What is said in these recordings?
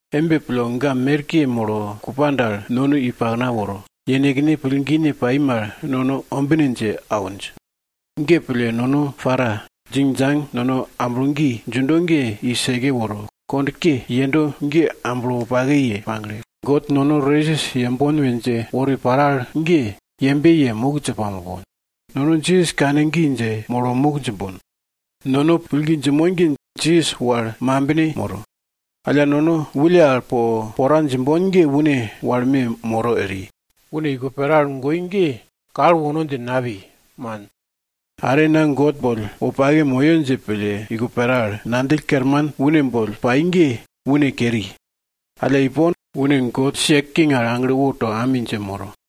Embe pille, ga merke molo kupa dal nono i pakna woro, yenekne pillgine pai mal nono ombine dje awinj. Ge pille, nono para, djingdjang nono amblo gi djindo ge i seke woro, kond ke yendo ge amblo wopake ye pagle, God nono resis yembon we dje wori paro al ge, yembe ye muk dje pamopon. Nono Jisas kane gi dje molo muk djimbon. Nono pillgi djinmon ge Jisas wal mambine moro. Alla nono wulle al po pora djimbon ge une wal me moro eri. Une iko pera al goi ge kal wono dje napi, man. Are na God boll wopake moyo dje pille iko pera al ngandjill kerman une boll pai ge, une keri. Alla ipon, une God sia king al agle woto ami dje moro.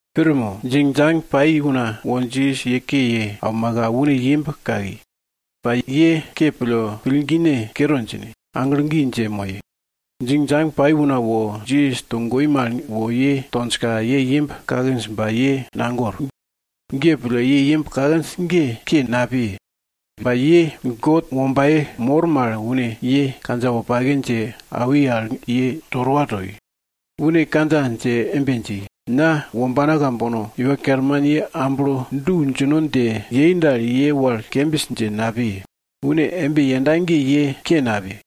Pir mo? Djingdjang pai una wo Jisas ye ke ye aumaka, une imb kaki. Ba ye ke pille pillgine kere djine, aglo gi dje moye. Djingdjang pai una wo Jisas togoi mal wo ye tonjka ye imb kakinj ba ye nagor. Ge pille ye imb kakinj ge ke napiye. Ba ye God wombaye mor mal une ye kandja wopake dje awi al ye torowa toi. Une kandja dje embe dji, Na wombana kambono, Iwa Kerman ye amblo du djino dje yei dal, ye wal kembis dje napiye, une embe yenda ge ye ke napiye.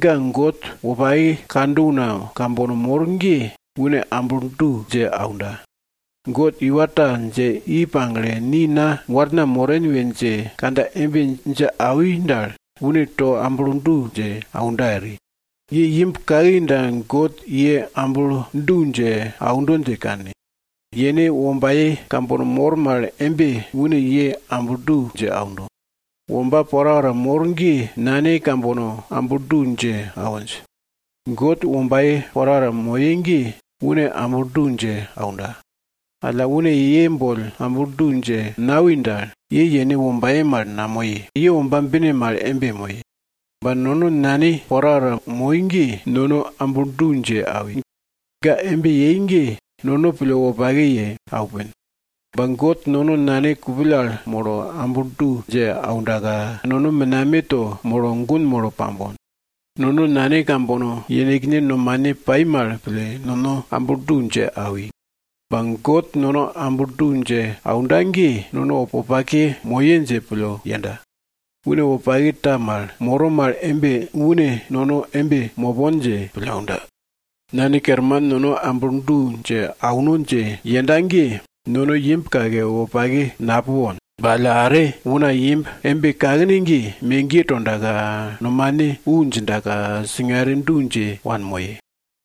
Ga God wopake kando una kambono mor ge une amblo du dje aunda. God iwa ta dje i pagle, ni na warna moren we dje kandja embe dje awi dal, une to amblo du dje aunda eri. Ye imb kaki dal God ye amblo du dje aundo dje kanne. Yene wombaye kambono mor mal embe une ye amblo du dje aundo. Womba porapora mor ge nane kambono amblo du dje awinj. God wombaye porapora moye ge une amblo du dje aunda. Alla, une ye boll amblo du dje nawi dal, ye yene wombaye mal namoye, ye womba bine mal embe moye. Ba nono nane porapora moi ge nono amblo du dje awi. Ga embe yei ge nono pille wopake ye aupin. Ba God nono Nane kupill al molo amblo du dje aundaka, nono menameto molo gun molo pambon. Nono nane kambono yenekne nomane pai mal pille nono amblo du dje awi. Ba God nono amblo du dje aunda ge, nono wopake mopon dje pille yenda, une wopake ta mal moro mal embe une nono embe mopon dje pille aunda. Nane Kerman nono amblo du dje auno dje yenda ge, nono imb kake, wopake napupon. Ba alla are, una imb embe kakne ge, megiye tondaka, nomane wu djindaka singare du dje yewanmoye.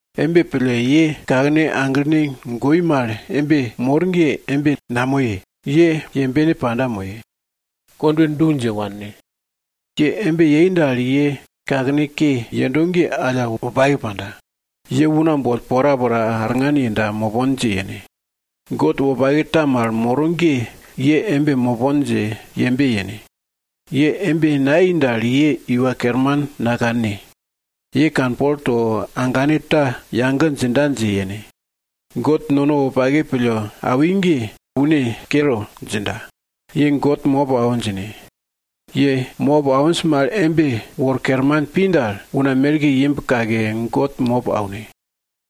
Embe pille, ye kakene aglene goi mal embe mor ge, embe namoye, ye yembene panda moye. Kondwe du dje wanne. Ye embe yei dal, ye kakene ke yendo ge alla wopake panda. Ye una boll porapora arngan yenda mopon dje yene. God wopake ta mal moro ge ye embe mopon dje yembe yene. Ye embe nayei dal ye Iwa Kerman nakanne. Ye kanpol to agane ta yage djinda dje yene. God nono wopake pille awi ge, une kere djinda. Ye God mop awo djine. Ye mop awinj mal embe wor kerman pi dal, una merke imb kake, God mop aune.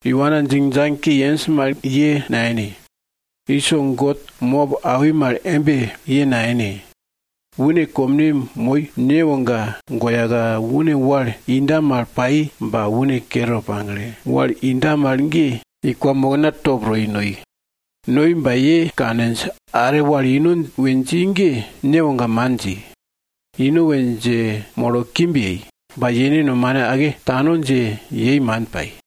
Iwana djingdjang ke yenj mal ye nayene. Iso God mop awi mal embe, ye nayene. Une komne moi newoga goyaka une wal inda mal pai ba, une kere pagle, wal inda mal ge, i kwamokna top to i noi. Noi ba, ye kaninj, are wal ino we dji ge newoga man dji. Ino we dje molo kimb yei. Ba yene nomane ake tano dje yei man pai.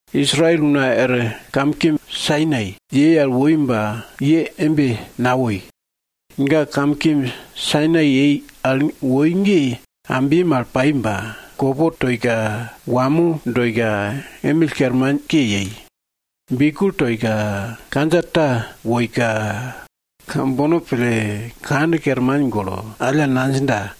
Israel una er kamkimb Sainai woi ba ye embe nawoi. Ga Kamkimb Sainai woi ge ambye mal pai ba kopo toika, wamo doika, emill kermanke yei. Biugel toika, kandja ta woika kambono pille kand kerman golo, alla nadjinda,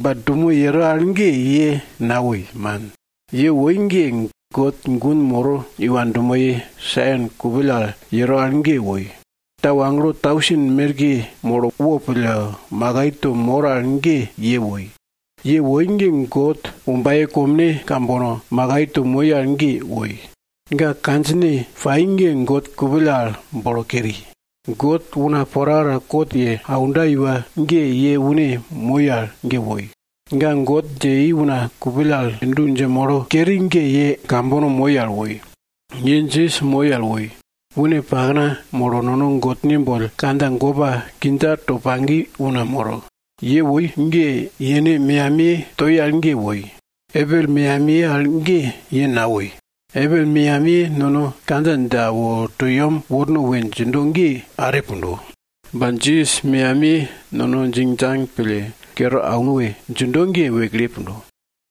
Ba dumo yero al ge ye nawoi, man. Ye woi ge, God gun moro iwa dumoye Sion kupill al yero al ge woi. Tau agelo tausen merke molo wopille makai to mor al ge ye woi. Ye woi ge, God wombaye komne kambono makai to moi al ge woi. Ga kandjine pai ge God kupill al bolo keri. God una porapora kot ye aunda iwa ge, ye une moi al ge woi. Ga God dje i una kupill al du dje molo keri ge ye kambono moi al woi. Ye Jisas moi al woi. Une pakna molo nono God boll kandja gopa kindja to pagi una moro. Ye woi ge yene meyamiye toi al ge woi. Abel meyamiye al ge ye nawoi. Abel meyamiye nono kandja dje awo to yem worno we djindo ge, are pundo. Ba Jisas meyamiye nono djingdjang pille kere auno we djindo ge wekle pundo.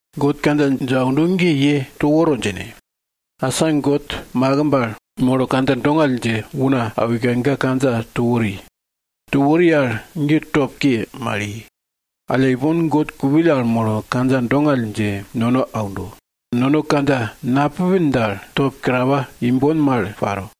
God kandja dje aundo ge ye to woro djine. Asa God makimb al molo kandja dongall dje una awika ga kandja to wori. To wori al ge top ke mal i. Alla, ipon God kupill al molo kandja dongall dje nono aundo. Nono kandja napupin dal, top kerawa imbon mal paro.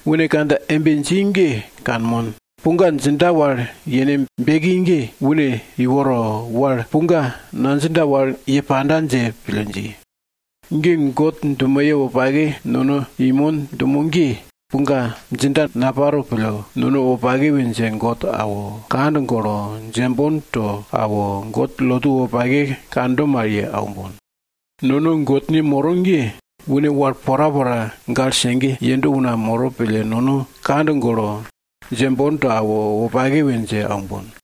Une kandja embe dji ge kanmon. Puga djinda wal yene beki ge une iworo, wal puga nadjinda wal ye panda dje pille dji. Ge God dumoye wopake nono inmon dumo ge, puga djinda naparo pille nono wopake we dje God awo, kand golo, djembon to awo, God lotu wopake kando mal ye aumbon. Nono Godne moro ge, une wal porapora gale sege yendo una moro pille nono kand golo, djembon to awo, wopake we dje aumbon.